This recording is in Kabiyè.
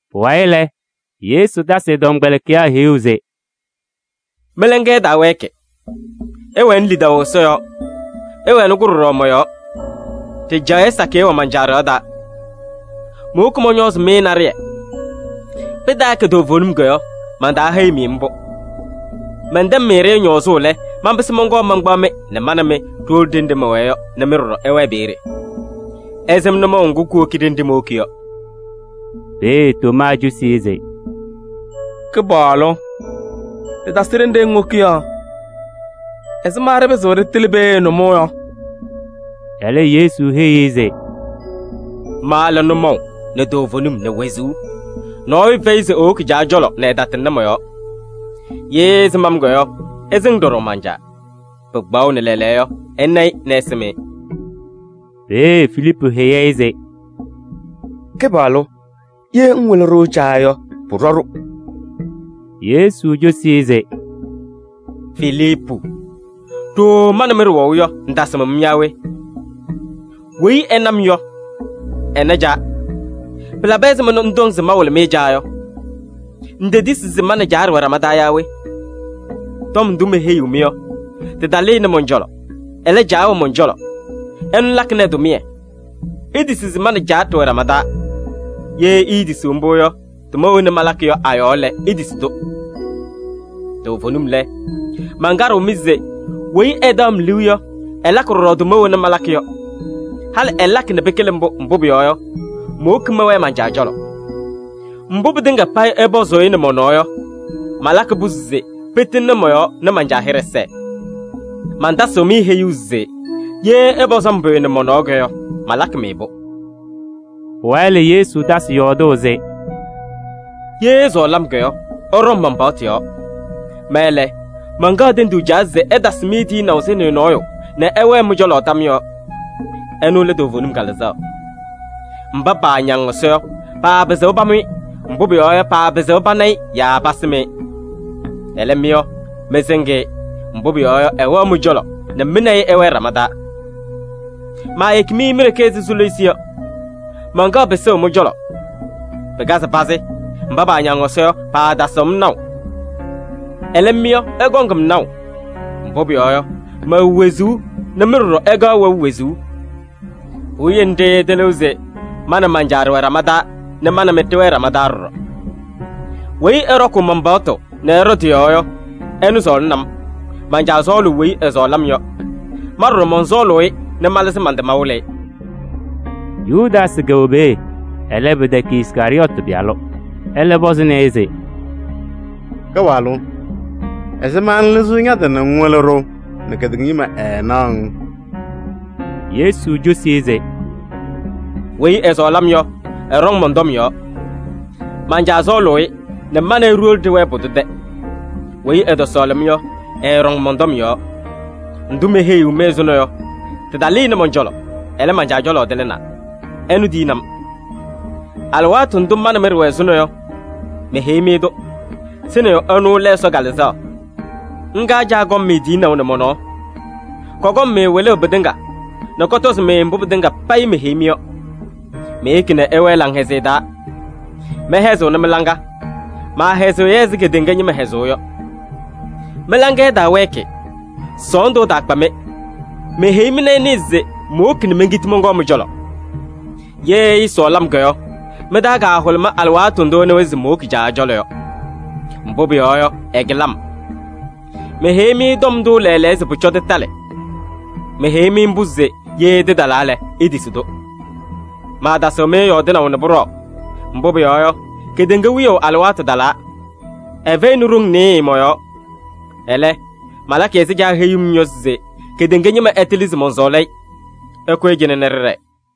Pʋwayɩ lɛ, Yesu tasɩ ɛ-tɔmkpɛlɩkɩyaa heyuu se: “Mɩ-laŋa ɛtaawɛɛkɩ, ɩwɛnɩ lidaʋ Ɛsɔ yɔɔ, ɩwɛnɩ-kʋ ɖɔɖɔ mɔ-yɔɔ. Ɖɩjaɣyɛ sakɩyɛ wɛ man-Caa ɖɩɣa taa. Mowoki mɔñɔɔzɩ-mɩ naɖɩyɛ. Pɩtaakɛ toovenim yɔ, mantaaheyi-mɩ mbʋ. Mɛntɛŋ-mɩ-ɖɩ ñɔɔzʋʋ lɛ, manpɩsɩ mɔnkɔɔ mankpaɣ-mɩ nɛ ma nɛ mɩ ɖiwolo ɖenɖe mɛwɛɛ yɔ nɛ mɩ ɖɔɖɔ ɩwɛɛ peeye. Ɩsɩm nʋmɔʋ ŋgʋ kuwoki ɖenɖe mowoki yɔ.” Peeye Tomaa cosi-i se: “Kɩpaɣlʋ! Ɖɩtasɩ ɖenɖe ŋwoki yɔ. Ɛzɩma ɖɩpɩzɩɣ ɖɩtɩlɩ peeye nʋmɔʋ yɔ?” Ɛlɛ Yesu heyi-i se: “Ma lɛ nʋmɔʋ nɛ toovenim nɛ wezuu. Nɔɔyʋ fɛyɩ se ewoki Caa cɔlɔ nɛ ɛtatɩŋnɩ mɔ-yɔɔ. Ye ɩsɩm-m yɔ, ɩsɩŋ ɖɔɖɔ man-Caa. Pɩkpaɣʋnɩ lɛɛlɛɛyɔ yɔ, ɩna-ɩ nɛ ɩsɩm-ɩ.” Peeye Filiipu heyi-i se: “Kɩpaɣlʋ! Ye ŋwɩlɩ-ɖʋ Caa yɔ, pʋɖɔ-ɖʋ.” Yesu cosi-i se: “Filiipu! Ɖooo ma nɛ mɩ ɖɩwɛʋ yɔ, ŋtasɩm-m yaa we? Weyi ɛna-m yɔ, ɛna Caa. Pɩlabɩ ɛzɩma nɛ ŋtɔŋ se mawɩlɩ-mɩ Caa yɔ? Ŋtetisi se ma nɛ Caa ɖɩwɛ ɖama taa yaa we? Tɔm ndʋ meheyiɣ-mɩ yɔ, tɩtalɩnɩ mɔn-cɔlɔ. Ɛlɛ, Caa wɛ mɔn-cɔlɔ, ɛnʋ lakɩnɩ ɛ-tʋmɩyɛ. Itisi se ma nɛ Caa ɖɩwɛ ɖama taa. Ye iitisiɣ mbʋ yɔ, tʋma wena malakɩ yɔ a-yɔɔ lɛ, itisi-tʋ. Toovenim lɛ, mankaɖɩɣ-mɩ se: weyi ɛtaɣ-m liu yɔ, ɛlakɩ ɖɔɖɔ tʋma wena malakɩ yɔ. Halɩ ɛlakɩ nɛ pɩkɩlɩ mbʋ, mbʋ pʋyɔɔ yɔ, mowoki mɛwɛɛ man-Caa cɔlɔ. Mbʋ pɩtɩŋa payɩ ɩpɔzʋʋ-ɩ nɛ mɔ-nɔɔ yɔ, malakɩ-pʋ se pɩtɩŋnɩ mɔ-yɔɔ nɛ man-Caa hɩɖɛ sɛɛ. Mantasɩɣ-mɩ heyuu se: ye ɩpɔzɩ-m pʋyʋ nɛ mɔ-nɔɔ yɔ, malakɩ-mɩ-pʋ.” Pʋwayɩ lɛ, Yesu tasɩ yɔɔdʋʋ se: “Ye ɩsɔɔlɩ-m yɔ, ɩɖɔŋ man-paɣtʋ yɔɔ. Ma lɛ, mankaɣ tenduu Caa se ɛtasɩ-mɩ tiyinaʋ Sɩnɩyʋ nɔɔyʋ nɛ ɛwɛɛ mɩ-cɔlɔ tam yɔɔ: ɛnʋ lɛ toovenim Kalɩzaɣ. Mba paañaŋ Ɛsɔ yɔ, paapɩzɩɣ pamʋ-ɩ, mbʋ pʋyɔɔ yɔ, paapɩzɩɣ pana-ɩ yaa pasɩm-ɩ. Ɛlɛ mɩ yɔ, mɩsɩŋ-ɩ, mbʋ pʋyɔɔ yɔ, ɛwɛɣ mɩ-cɔlɔ nɛ mɩ nɛ ɩ ɩwɛɛ ɖama taa. Maayeki-mɩ mi-ɖeke ɛzɩ soliisi yɔ, mankaɣ pɩsʋʋ mɩ-cɔlɔ. Pɩkazɩ pazɩ, mba paañaŋ Ɛsɔ yɔ, paatasɩɣ-m naʋ. Ɛlɛ mɩ yɔ, ɩkɔŋ-m naʋ, mbʋ pʋyɔɔ yɔ, mɛwɛ wezuu nɛ mɩ ɖɔɖɔ ɩkaɣ wɛʋ wezuu. Puwiye nɖɩ ɩtɩlɩɣ se ma nɛ man-Caa ɖɩwɛ ɖama taa nɛ ma nɛ mɩ ɖɩwɛɛ ɖama taa ɖɔɖɔ. Weyi ɛɖɔkʋʋ man-paɣtʋ nɛ ɛɖɔ tɩ-yɔɔ yɔ, ɛnʋ sɔɔlɩnɩ-m. Man-Caa sɔɔlʋʋ weyi ɛsɔɔlɩ-m yɔ. Ma ɖɔɖɔ mɔnsɔɔlʋʋ-ɩ nɛ malɩzɩ man-tɩ mawɩlɩ-ɩ.” Yudaasɩ kɛwɛ peeye, ɛlɛ, pɩtɛkɛ Iskarɩyɔɔtɩ pɩyalʋ. Ɛlɛ pɔzɩnɩ-ɩ se: “Kɩpaɣlʋ! Ɛzɩma ŋlɩzɩɣ ña-tɩ nɛ ŋwɩlɩ-ɖʋ nɛ kedeŋa ñɩma ɛɛnaɣ-ŋ?” Yesu cosi-i se: “Weyi ɛsɔɔlɩ-m yɔ, ɛɖɔŋ mɔn-tɔm yɔɔ. Man-Caa sɔɔlʋʋ-ɩ nɛ ma nɛ ɩ ɖiwolo ɖɩwɛɛ pʋdʋ tɛ. Weyi ɛtɔsɔɔlɩ-m yɔ, ɛɛɖɔŋ mɔn-tɔm yɔɔ. Ndʋ meheyiɣ-mɩ ɛzʋnɔ yɔ, tɩtalɩnɩ mɔn-cɔlɔ, ɛlɛ, man-Caa cɔlɔ tɩlɩnaa. Ɛnʋ tiyini-m. Alɩwaatʋ ndʋ ma nɛ mɩ ɖɩwɛ ɛzʋnɔ yɔ, meheyi-mɩ-tʋ. Sɩnɩyʋ ɛnʋ lɛ Ɛsɔ Kalɩzaɣ. Ŋga Caa kɔŋ-mɩ tiyinaʋ nɛ mɔ-nɔɔ. Kɔkɔŋ-mɩ wɩlʋʋ pɩtɩŋa nɛ kɔtɔzɩ-mɩ mbʋ pɩtɩŋa payɩ meheyi-mɩ yɔ. Meyeki nɛ ɩwɛɛ laŋhɛzɩyɛ taa, mɛhɛzɩɣnɩ mɩ-laŋa. Maahɛzɩɣ-yɛ ɛzɩ kedeŋa ñɩma hɛzʋʋ yɔ. Mɩ-laŋa ɛtaawɛɛkɩ, sɔɔndʋ ɛtaakpa-mɩ. Meheyi-mɩ nɛ ɩnɩɩ se mowoki nɛ menkiti mɔnkɔɔ mɩ-cɔlɔ. Ye ɩɩsɔɔlɩ-m yɔ, mɩ-taa kahʋlʋmɩ alɩwaatʋ ndʋ ɩnɩwa se mowoki Caa cɔlɔ yɔ. Mbʋ pʋyɔɔ yɔ, ɛkɩlɩ-m. Meheyi-mɩ tɔm ndʋ lɛɛlɛɛyɔ se pʋcɔ tɩtalɩ. Meheyi-mɩ mbʋ se ye tɩtalaa lɛ, itisi-tʋ. Maatasɩɣ-mɩ yɔɔdɩnaʋ nɛ pʋɖɔɔ, mbʋ pʋyɔɔ yɔ, kedeŋa wiyaʋ alɩwaatʋ talaa. Ɛfɛyɩnɩ ɖoŋ nɩɩyɩ mɔ-yɔɔ. Ɛlɛ, malakɩ ɛzɩ Caa heyuu-m yɔ se kedeŋa ñɩma ɛtɩlɩ se mɔnsɔɔlɩ-ɩ. Ɩkʋyɩ cɩnɛ nɛ ɖɩɖɛɛ!”